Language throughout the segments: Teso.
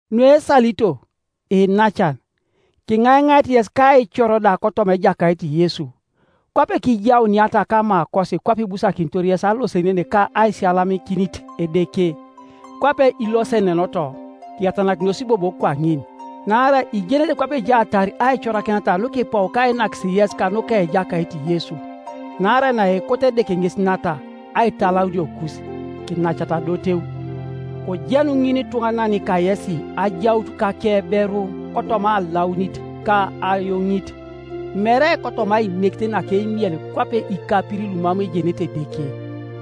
Nuesalito, iinacan, kiŋaiŋait yes ka aicor da kotoma Ejakait Yesu, kwape kijauniata kamakosi kwape ibusakinitor yes alosenen ka aisiyalamikinit Edeke, kwape ilosenenoto, kiyatanakinos bobo kwaŋin, Naarai ijenete kwape ejaatar aicorakineta nukipou kainakis yes kanuka Ejakait Yesu. Naarai naekoto Edeke ŋes nata, aitalauniokus: kinacata adoteu; kojenu ŋinituŋanan kayesi ajaut kakeberu kotoma alaunite ka ayoŋit, mere kotoma ainekit naka eimiel kwape ikapirin Iumam ejenete Edeke;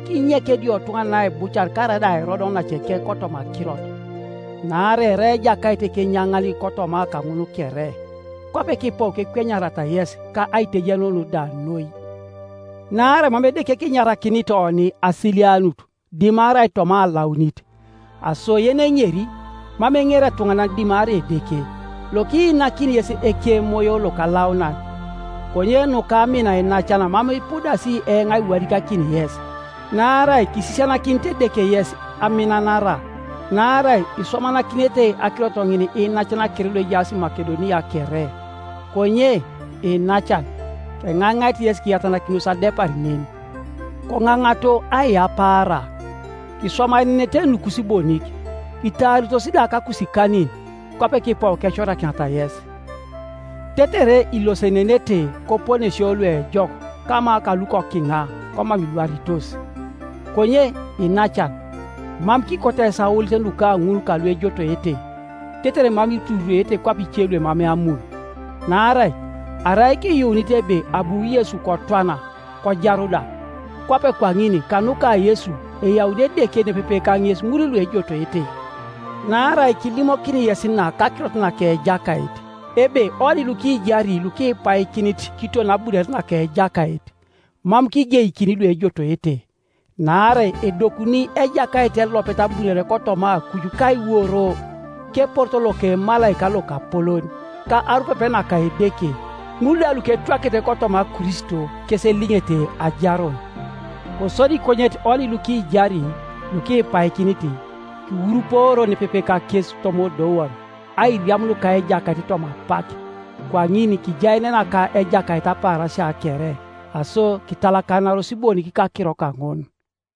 kinyek ediotuŋanan aibucar karaida airod onaceke kotoma akirot, naarai erai Ejakait ekenyaŋan kotoma kaŋun kere, kwape kipou kekwenyariata yes ka aitejenun da noi. Naarai mam Edeke kinyarakinit oni asilianut, dimarai toma alaunit. Aso yeneŋeri, mam eŋeri etuŋanan dimarai Edeke, lokiinakini yes Ekemoyo Lokalaunan. Konye nuka amin iinacan mam ipudasi eoŋ aiwadikakin yes, naarai kisisianakinit Edeke yes aminanara; naarai iswamanakinete akirot ŋin iinacan kere luejaas Makedonia kere, Konye, iinacan, keŋaiŋait yes kiyatanakinos adepar nen, koŋaŋato aiyapaara, kiswamaenenete nukus bonik, kitaaritos da kakusikanin, kwape kipou kecorakiniata yes, tetere ilosenenete koponesio luejok kama kalukokina komam ilwaritos. Konye iinacan, mam kikoto yes aolit nuka ŋul kaluejotoete, tetere mam itururwete kwape ice luemamei amun. Naarai arai kiyuunit ebe abu Yesu kotwana, kojaru da, kwape kwaŋin kanuka Yesu eyauni Edeke nepepe kaŋes ŋul luejotoete. Naarai kilimokini yes na kakirot naka Ejakait, ebe onilukijari lukipaikinit kiton abunore naka Ejakait, mam kigeikini luejotoete. Naarai edokuni Ejakait elopet abunore kotoma akuj kaiworo, keporoto loka emalaika lokapolon, ka arupepe naka Edeke. Ŋul da luketwakete kotoma Kristo, kes eliŋete ajarun; kosodi konyet oni lukijari, lukipaikinit, kiwuruporio nepepe kakes toma odoun, airiamun ka Ejakait toma apak; kwaŋin kijaenena ka Ejakait apaarasia kere. Aso kitalakanaros bonik kakiro kaŋun.